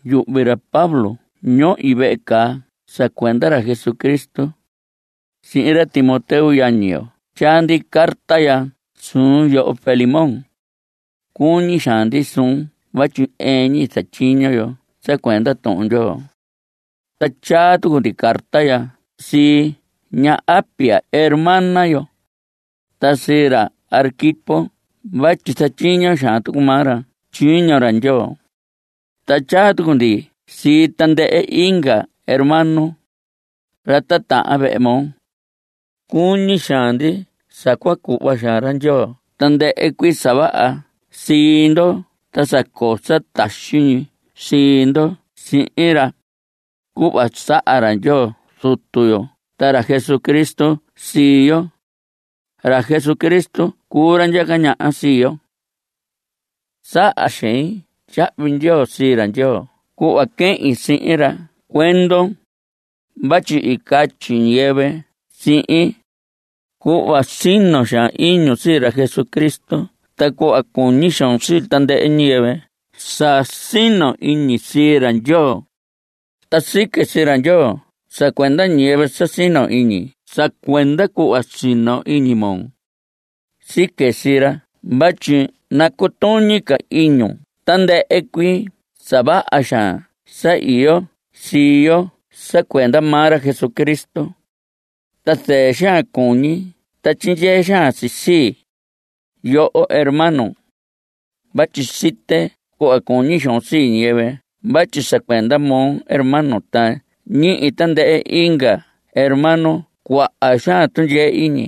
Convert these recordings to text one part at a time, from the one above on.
Yuhvi ra Pablo ñohi vehe caa sa cuenda ra Jesucristo. Sihin ra Timoteo yañi yo tyaa ndi carta ya suun yoho Filemón. Cuñi xaan ndi suun vatyi ɨɨn ñi zatyiño yo sa cuenda Tuhun Ndyoo. Ta tyaa tucu ndi carta ya sii ña Apia, hermana yo, ta sii ra Arquipo vatyi zatyiño xaan tucu maa ra tyiño ra Ndyoo, ta tyaa tucu ndi sii tandɨhɨ inga hermano, ra titahan vehe moo. Cuñi xaan ndi sa cua cuhva xaan ra Ndyoo tandɨhɨ cuii sa vaha sii ndo ta sa coo sa taxi ñi sii ndo sihin ra, cuhva saha ra Ndyoo Zutu yo ta ra Jesucristo sii yo. Ra Jesucristo cuu ra ndyaca ñaha sii yo. Saha xein tyahvi ndyoo sii ra Ndyoo cuhva quehin sihin ra cuendon, vatyi i catyi ñiyɨvɨ sihin, cuhva sino xaan iñun sii ra Jesucristo ta cuhva cuñi xoon sii tandɨhɨ ñiyɨvɨ sa sino iñi sii ra Ndyoo. Ta sique sii ra Ndyoo sa cuenda ñiyɨvɨ sa sino iñi sa cuenda cuhva sino iñi moo. Sique sii ra vatyi nacutuñi ca iñi ñu tandɨhɨ cuii sa vaha xaan sa iyo sii yo sa cuenda maa ra Jesucristo. Ta zɨɨ xaan cuñi ta tyindyee xaan si sii, yoho hermano, vatyi site cuhva cuñi xoon sii ñiyɨvɨ vatyi sa cuenda moo hermano ta ñihi tandɨhɨ inga hermano cuaha xaan tundyee iñi.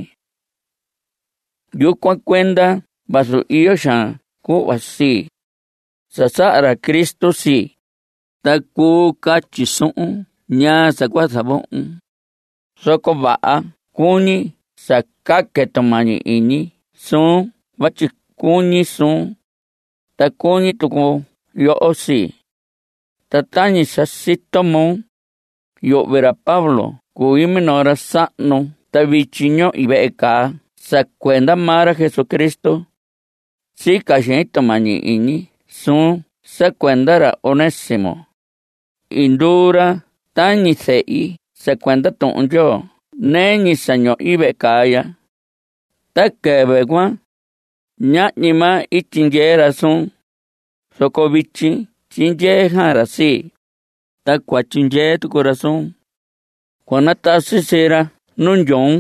Yucuan cuenda vazu iyo xaan cuhva sii, sa saha ra Cristo sii, ta cuu catyi suhun ñaa sa cua zavohon, zoco vaha cuñi sa caque tumañi iñi suun vatyi cuñi suun, ta cuñi tucu yoho sii. Ta tañi sa sito moo, yuhvi ra Pablo cui minoo ra sahnu, ta vityi ñohi vehe caa sa cuenda maa ra Jesucristo. Sica xein tumañi iñi suun sa cuenda ra Onésimo. I nduu ra tañi zehi sa cuenda Tuhun Ndyoo nɨɨ ñi sa ñohi vehe caa ya. Ta quɨvɨ cuan, ñahñi maa i tyindyee ra suun, zoco vityi tyindyee xaan ra sii, ta cua tyindyee tucu ra suun. Cua natasi sii ra nu ndyoon.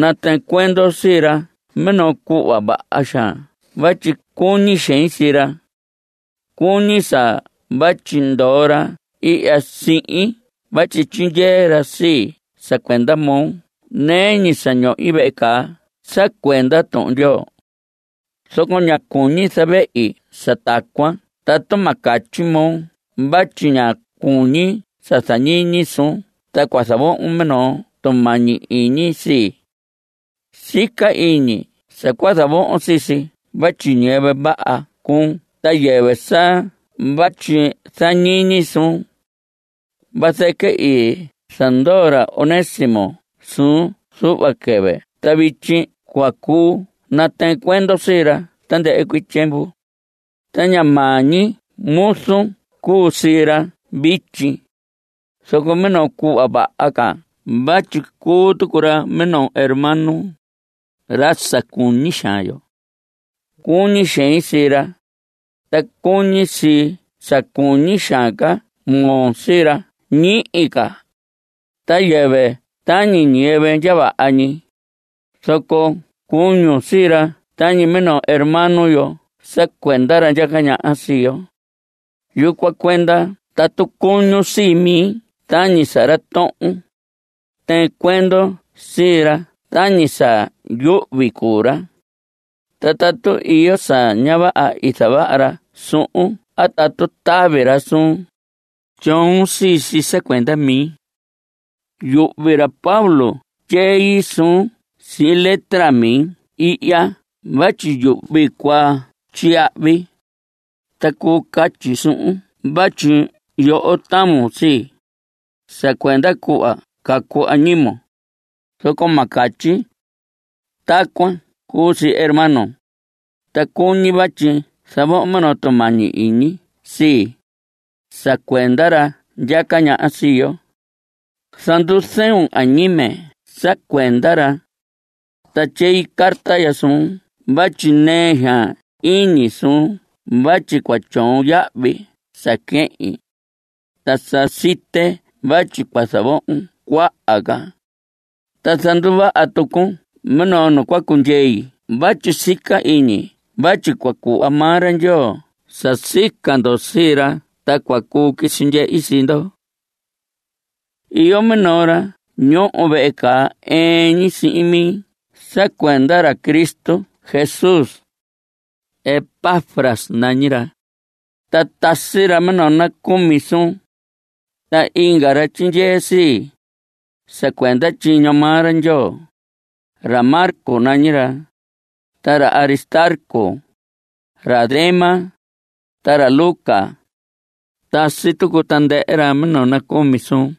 Natɨɨn cuendon sii ra minoo cuhva vaha xaan vatyi cuñi xein sii ra. Cuñi sa vatyi ndoo ra ihya sihin vatyi tyindyee ra sii sa cuenda moo nɨɨ ñi sa ñohi vehe caa sa cuenda Tuhun Ndyoo. Zoco ña cuñi zavehi sa tacuan tatu ma catyi moo vatyi ña cuñi zañiñi suun ta cua zavohon minoo tumañi iñi sii. Sica iñi sa cua zavohon sii si vatyi ñiyɨvɨ vaha cuun ta yɨvɨ sa vatyi zañiñi suun. Vazɨquɨ i zandoo ra Onésimo suun zuhva quɨvɨ ta vityi cua cuu natɨɨn cuendon sii ra tandɨhɨ cuii tyiemvu. Ta ña maa ñi muzun cuu sii ra vityi, zoco minoo cuhva vaha ca vatyi cuu tucu ra minoo hermano, ra sa cuñi xaan yo. Cuñi xein sii ra, ta cuñi si sa cuñi xaan ca moo sii ra ñihi ca. Ta yɨvɨ tañi ñiyɨvɨ ndya vaha ñi, zoco cuñun sii ra tañi minoo hermano yo sa cuenda ra ndyaca ñaha sii yo. Yucuan cuenda tatu cuñun sii mi tañi sa ra tohon, tɨɨn cuendon sii ra tañi sa yuhvi cuu ra. Ta tatu iyo sa ña vaha i zavaha ra suhun a tatu tavi ra suun, tyoon sii si sa cuenda mi. Yuhvi ra Pablo tyei zuun ñi sihin letra mi ihya vatyi yuhvi cua tyiyahvi. Ta cuu catyi suhun vatyi yoho tavun sii, sa cuenda cuhva cacu añimon, zoco ma catyi. Tacuan cuu si hermano, ta cuñi vatyi zavohon minoo tumañi iñi sii, sa cuenda ra ndyaca ñaha sii yo. Zanduzɨun añime sa cuenda ra. Ta tyei carta ya suun vatyi nɨɨ xaan iñi suun vatyi cua tyoon yahvi sa quehin. Ta sa site vatyi cua zavohon cuaha ca. Ta zanduvaha tucun minoo nu cua cundyei vatyi sica iñi vatyi cua cuhva maa ra Ndyoo sa sica ndo sii ra ta cua cuu quisi ndyehi sii ndo. Iyo minoo ra ñoho vehe caa ɨɨn ñi sihin mi sa cuenda ra Cristo Jesús. Epafras nañi ra, ta tasi ra minoo nacumi suun. Ta inga ra tyindyee sii, sa cuenda tyiño maa ra Ndyoo, Marcos nañi ra, ta ra Aristarco, ra Demas, ta ra Lucas. Tasi tucu tandɨhɨ ra minoo nacumi suun.